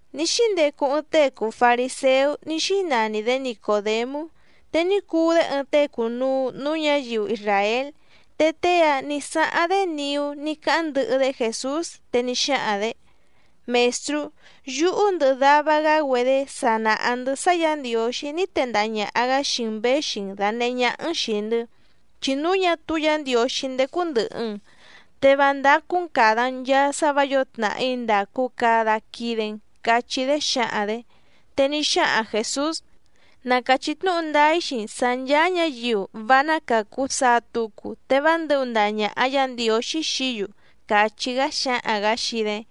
Ní xíndecu ɨɨⁿ tée cùu fariséú ní xínani‑dě Nicòdemú, te ní cuu‑dé ɨɨⁿ tée cùnuu núú ñǎyiu isràél. Te tée‑áⁿ nǐ sáháⁿ‑dé niú ní cáháⁿ ndɨhɨ‑dé Jèsús, te ní xáhaⁿ‑dě: —Mèstrú, yúhú ndɨhɨ dava‑gá‑güedé sa nàha‑ndɨ́ sá Yǎ Ndiǒxí ní tendaha ñàha‑gá xii‑n věxi‑n dànehé ñáhá‑n xìi‑ndɨ́, chi núu ñá túú Yǎ Ndiǒxí ndécú ndɨ̀hɨ‑n, te vá ndácú‑n càda‑n nchaa sá vǎ yǒo tnàhí ndàcu cada quide‑n —cachí‑dé xǎhaⁿ‑dě. Te ní xáhaⁿ Jèsús: —Na càchí tnúhu ndáá‑í xii‑n sǎ ncháá ñǎyiu vá ná càcu saa tucu, te vá ndɨ̌hu ndaha ñàha Yá Ndiǒxí xií‑yu —càchí‑gá xáhaⁿ‑gǎ xii‑dé.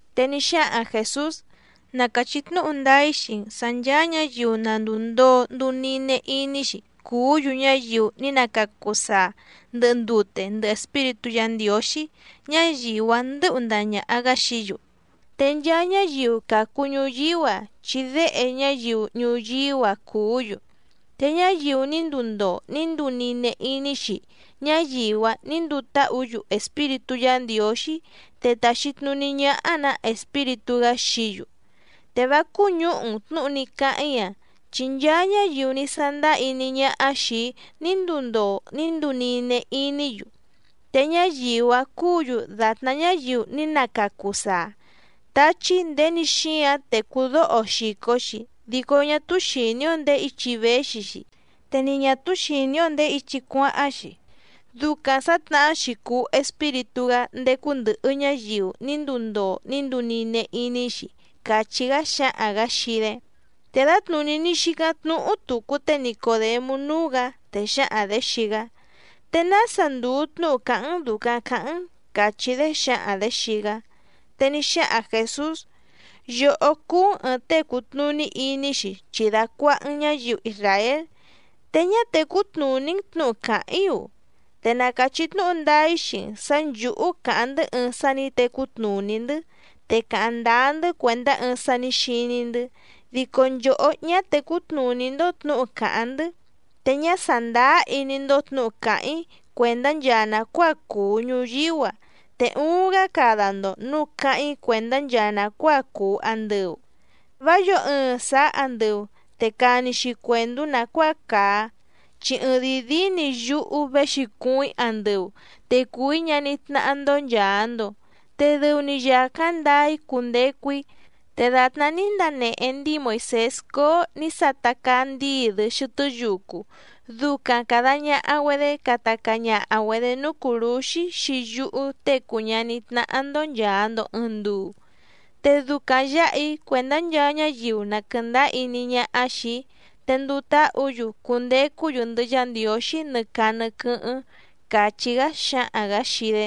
Te ní xáhaⁿ Jèsús: —Na càchí tnúhu ndáá‑í xii‑n sǎ nchàa ñáyiu na ndùu ndoo nduu nine iní‑xi cuú‑yu ñáyiu ní na càcu saa ndɨhɨ ndute ndɨhɨ Espíritú Yǎ Ndiǒxí, ñáyiu‑áⁿ ndɨ̌hu ndaha ñàha‑gá xií‑yu. Te nchaa ñáyiu càcu ñuyíú‑a, chi déhe ñáyiu ñuyíú‑a cùú‑yu. Te ñáyiu ní nduu ndoo ní nduu nine iní‑xi, ñáyiu‑áⁿ nǐ nduu táhǔ‑yu Espíritú Yǎ Ndiǒxí te tàxi tnuní ñáhá‑nǎ Espíritú‑gá xií‑yu. Te vá cúñǔhu‑n tnǔhu ní cáháⁿ‑í‑a, chi nchaa ñáyiu ní sándáá iní ñáhá xìi‑í ní nduu ndoo ní nduu nine iní‑yu, te ñáyiu‑áⁿ cúǔ‑yu dàtná ñáyiu ní nacacu saa. Táchí nděni xíáⁿ tècú dóho‑o xìco‑xi, dico ñá túú xìní‑ó ndèé ichi véxi‑xi, te ni ñà túú xìní‑ó ndèé ichi cuáháⁿ‑xi. Ducaⁿ sǎtnahá‑xi cùu Espíritú‑gá ndécú ndɨ̀hɨ ñáyiu ní nduu ndoo ní nduu nine iní‑xi —càchí‑gá xáhaⁿ‑gǎ xii‑dé. Te dǎtnùní ní xícáⁿ tnúhú tùcu té Nicòdemú núú‑gǎ, te xǎhaⁿ‑dě xii‑gá: —¿Te nása ndùu tnúhu càháⁿ‑n dùcaⁿ caháⁿ‑n? —càchí‑dé xǎhaⁿ‑dě xii‑gá. Te ní xáhaⁿ Jèsús: —Yòhó cúú‑n ɨ̀ɨⁿ tée cùtnuní iní‑xi, chi dàcuaha‑n ñáyiu isràél, ¿te ñá tècú tnùní‑n tnǔhu càháⁿ‑í‑u? Te na càchí tnúhu ndáá‑í xii‑n sǎ nchǔhú càháⁿ‑ndɨ́ ɨɨⁿ sá nǐ tecú tnùní‑ndɨ́, te càháⁿ ndáá‑ndɨ́ cuèndá ɨɨⁿ sá nǐ xiní‑ndɨ́. Dico nchòhó ñá tècú tnùní‑ndó tnǔhu càháⁿ‑ndɨ́. Te ñá sàndáá iní‑ndó tnǔhu càháⁿ‑í cuèndá nchaa nàcuáa cùu ñuyíú‑a, te uuⁿ‑gá cada‑ndo nǔu cáháⁿ‑í cuèndá nchaa nàcuáa cùu andɨu. ’Vá yǒo ɨɨⁿ sàá andɨu, te cani‑xi cuèndú nàcuáa càa. Chi ɨɨⁿdìi díí‑ni yúhú véxi cuuⁿ‑í andɨu, te cùu‑í ñaní tnáhá‑ndó nchàa‑ndo. Te dɨu‑ni yàcáⁿ ndaa‑í cundecu‑í. Te dàtná ní ndanehe ndíi Moìsés cóó nǐ sata caa ndíi‑dɨ xɨtɨ́ yucu, ducaⁿ càda ñaha‑güedé cata caa ñaha‑güedě núú cùrúxí xii yúhú Tée cùu ñaní tnáhá‑ndó nchàa‑ndo ɨɨⁿ nduu, te ducaⁿ yǎha‑í cuèndá nchaa ñáyiu na quɨ̀ndáá iní ñáhá xìi‑í te nduu táhǔ‑yu cundecú‑yu ndɨhɨ Yá Ndiǒxí nɨ caa nɨ quɨ́hɨ́ⁿ —càchí‑gá xáhaⁿ‑gǎ xii‑dé.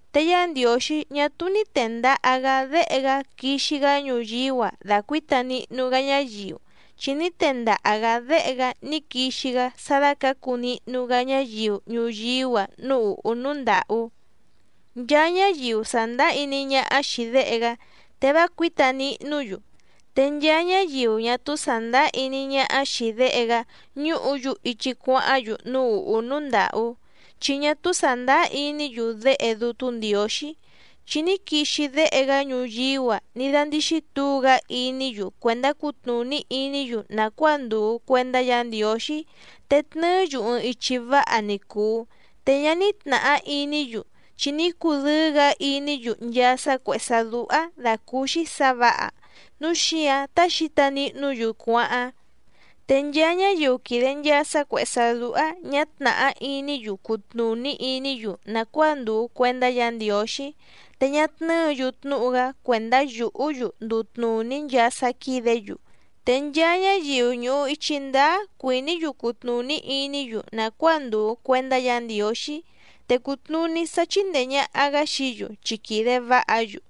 Te Yá Ndiǒxí ñá túú ní tèndaha‑gá Déhe‑gá quixi‑gá ñuyíú‑a dacuǐta nihnu‑gá ñáyiu, chi ní tendaha‑gǎ Déhe‑gá ní quixi‑gá sá dácǎcu nihnu‑gá ñáyiu ñuyíú‑a núú ùhú núú ndàhú. Nchaa ñáyiu sàndáá iní ñáhá xìi Déhe‑gá, te vá cuǐta nihnú‑yu. Te nchaa ñáyiu ñá túú sàndáá iní ñáhá xìi Déhe‑gá ñùhú‑yu ichi cuáháⁿ‑yu núú ùhú núú ndàhú, chi ñá túú sàndáá iní‑yu Déhe Dútú Ndiǒxí. Chi ní quixi Déhe‑gá ñuyíú‑a ní dándíxí tǔu‑gá iní‑yu cuèndá cutnùní iní‑yu nàcuáa ndùu cuendá Yǎ Ndiǒxí te tnɨɨ́‑yu ɨɨⁿ ichi váha ni cùu, te ñá ní tnàhá iní‑yu, chi ní cudɨ́ɨ́‑gǎ iní‑yu nchaa sá cuèhé sá dúhá dàcúúxí sǎ vǎha, núu xíǎⁿ tá xǐta nihnú‑yu cuáháⁿ. Te nchaa ñáyiu quìde nchaa sá cuèhé sá dúhá ñǎ tnàhá iní‑yu cutnùní iní‑yu nàcuáa ndùu cuendá Yǎ Ndiǒxí, te ñá tnɨ́ɨ̌‑yu tnúhu‑gá cuèndá yùhú‑yu nduu tnùní nchaa sá quídě‑yu. Te nchaa ñáyiu ñùhu ichi ndáá cuìní‑yu cutnùní iní‑yu nàcuáa ndùu cuendá Yǎ Ndiǒxí, te cùtnuní sá chíndèe ñaha‑gá xií‑yu, chi quìde váha‑yu.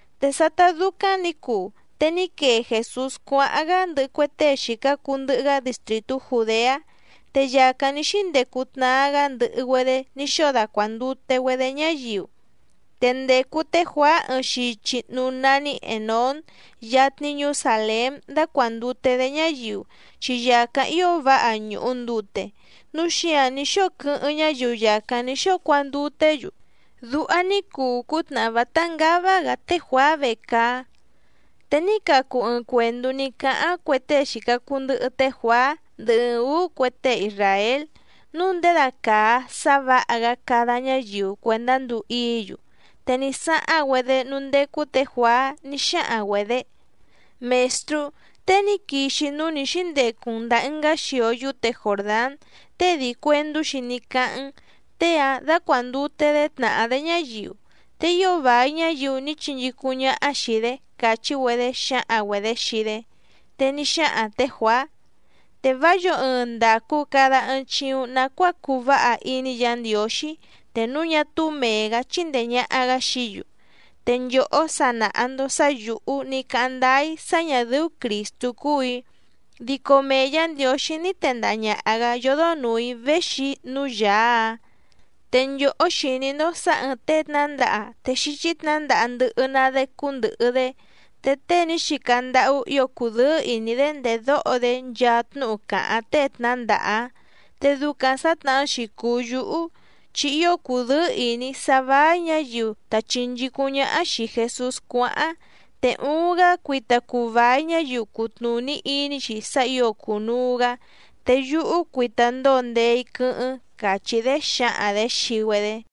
Te sátá dúcáⁿ nǐ cuu, te ní quee Jèsús cuáháⁿ‑gá ndɨhɨ cue tée xìca cuu ndɨhɨ‑gá distrìtú Jùdeá. Te yàcáⁿ ní xíndecu tnaa‑gá ndɨhɨ‑güedé ní xóo dacuàndute‑güedé ñáyiu. Te ndècu té Juàá ɨɨⁿ xichi núú nání Ènón yatni ñuú Sàlém dácuàndute‑dé ñáyiu, chi yàcáⁿ ío váha ñùhu ndute, núu xíǎⁿ ní xóo quɨ́hɨ́ⁿ ñáyiu yàcáⁿ ní xóo cuanduté‑yu. Duha ní cuu cútnàhá vátá ngává‑gǎ té Juàá vecaá. Te ní cacu ɨɨⁿ cuèndú ní cáháⁿ cue tée xìca cuu ndɨhɨ té Juàá ndɨhɨ ɨɨⁿ ǔú cue tée isràél, núu ndědacàa sá vǎha‑gá cada ñáyiu cuèndá nduu íǐ‑yu. Te ní sáháⁿ‑güedé núú ndécú tě Juàá ní xáhaⁿ‑güedě: —Mèstrú, tée ní quixi núú nǐ xíndecu‑n ndàa ɨngá xio yúte Jòrdán, tée dii cuèndú‑xi ní cáháⁿ‑n, tée‑ǎⁿ dácuàndute‑dé tnàhá‑dé ñáyiu. Te ío vài ñáyiu ní chinchícúⁿ ñáhá xìi‑dé —càchí‑güedé xǎhaⁿ‑güedě xii‑dé. Te ní xáhaⁿ tě Juàá: —Te vá yǒo ɨɨⁿ ndàcu cada ɨɨⁿ chiuⁿ nacuáa cuu váha iní Yǎ Ndiǒxí, te núu ñá túú mèe‑gá chíndèe ñaha‑gá xií‑yu. Te nchòhó sa nàha‑ndo sá yǔhú ní cáháⁿ ndáá‑í sá ñà dɨ́ú Crìstú cúù‑í, dico mee Yǎ Ndiǒxí ní tendaha ñàha‑gá yódó nùu‑í véxi núú Yàá‑áⁿ. Te nchòhó xìní‑ndó sǎ ɨ̀ɨⁿ tée tnǎndaha te xíchí tnǎndaha ndɨhɨ‑ná‑dé cúndɨ̀hɨ‑dé. Te tée ní xica ndáhú ǐo cùdɨ́ɨ́ ìní‑dé ndèdóho‑dé nchaa tnúhu càháⁿ tée tnǎndaha‑áⁿ. Te ducaⁿ sǎtnahá‑xi cùu yúhú, chi ío cùdɨ́ɨ́ ìní‑í sá váí ñǎyiu ta chìnchícúⁿ ñáhá xìi Jesús cuáháⁿ. Te uuⁿ‑gá cuita cuu vài ñáyiu cutnùní iní‑xi sá ǐo cùnuu‑gá, te yúhú cuita ndóo ndee‑í quɨ́hɨ́ⁿ —càchí‑dé xǎhaⁿ‑dě xii‑güedé.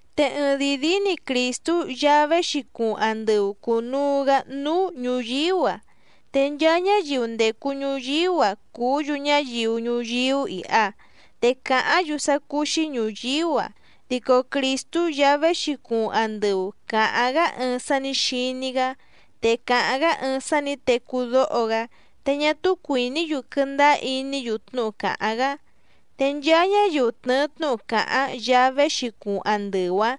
Te ɨɨⁿdìi díí‑ni Crìstú Yaá véxi cuuⁿ andɨu cùnuu‑gá núú ñùyíú‑a. Te nchaa ñáyiu ndècu ñuyíú‑a cùú‑yu ñáyiu ñuyíú iha, te càháⁿ‑yu sá cúú‑xí ñùyíú‑a. Dico Crìstú Yaá véxi cuuⁿ andɨu càháⁿ‑gá ɨɨⁿ sá nǐ xiní‑gá, te càháⁿ‑gá ɨɨⁿ sá nǐ tecú dóho‑gá. Te ñá túú cuìní‑yu quɨndáá iní‑yu tnúhu càháⁿ‑gá. Te nchaa ñáyiu tnɨ̀ɨ tnúhu càháⁿ Yaá véxi cuuⁿ andɨu‑áⁿ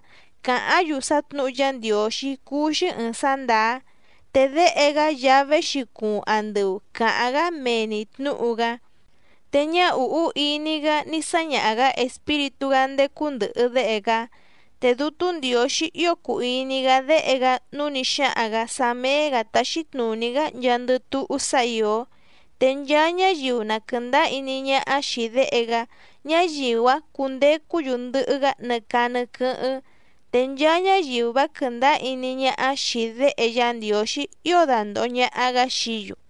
càháⁿ‑yu sá tnǔhu Yá Ndiǒxí cúú‑xí ɨ̀ɨⁿ sá ndàá. Te Déhe‑gá Yaá véxi cuuⁿ andɨu càháⁿ‑gá mee‑ni tnǔhu‑gá. Te ñá ùhú iní‑gá ní sáñaha‑gǎ Espíritú‑gá ndécú ndɨ̀hɨ Déhe‑gá. Te Dútú Ndiǒxí ío cùu iní‑gá Déhe‑gá, núu ní xáhaⁿ‑gǎ sá méé‑gǎ taxi tnùní‑gá nchaandɨ túhú sá ìó. Te nchaa ñáyiu na quɨ̀ndáá iní ñáhá xìi Déhe‑gá, ñáyiu‑áⁿ cundecú‑yu ndɨhɨ‑gá nɨ caa nɨ quɨ́hɨ́ⁿ. Te nchaa ñáyiu vá quɨ̀ndáá iní ñáhá xìi Déhe Yá Ndiǒxí ío dandòho ñaha‑gá xií‑yu.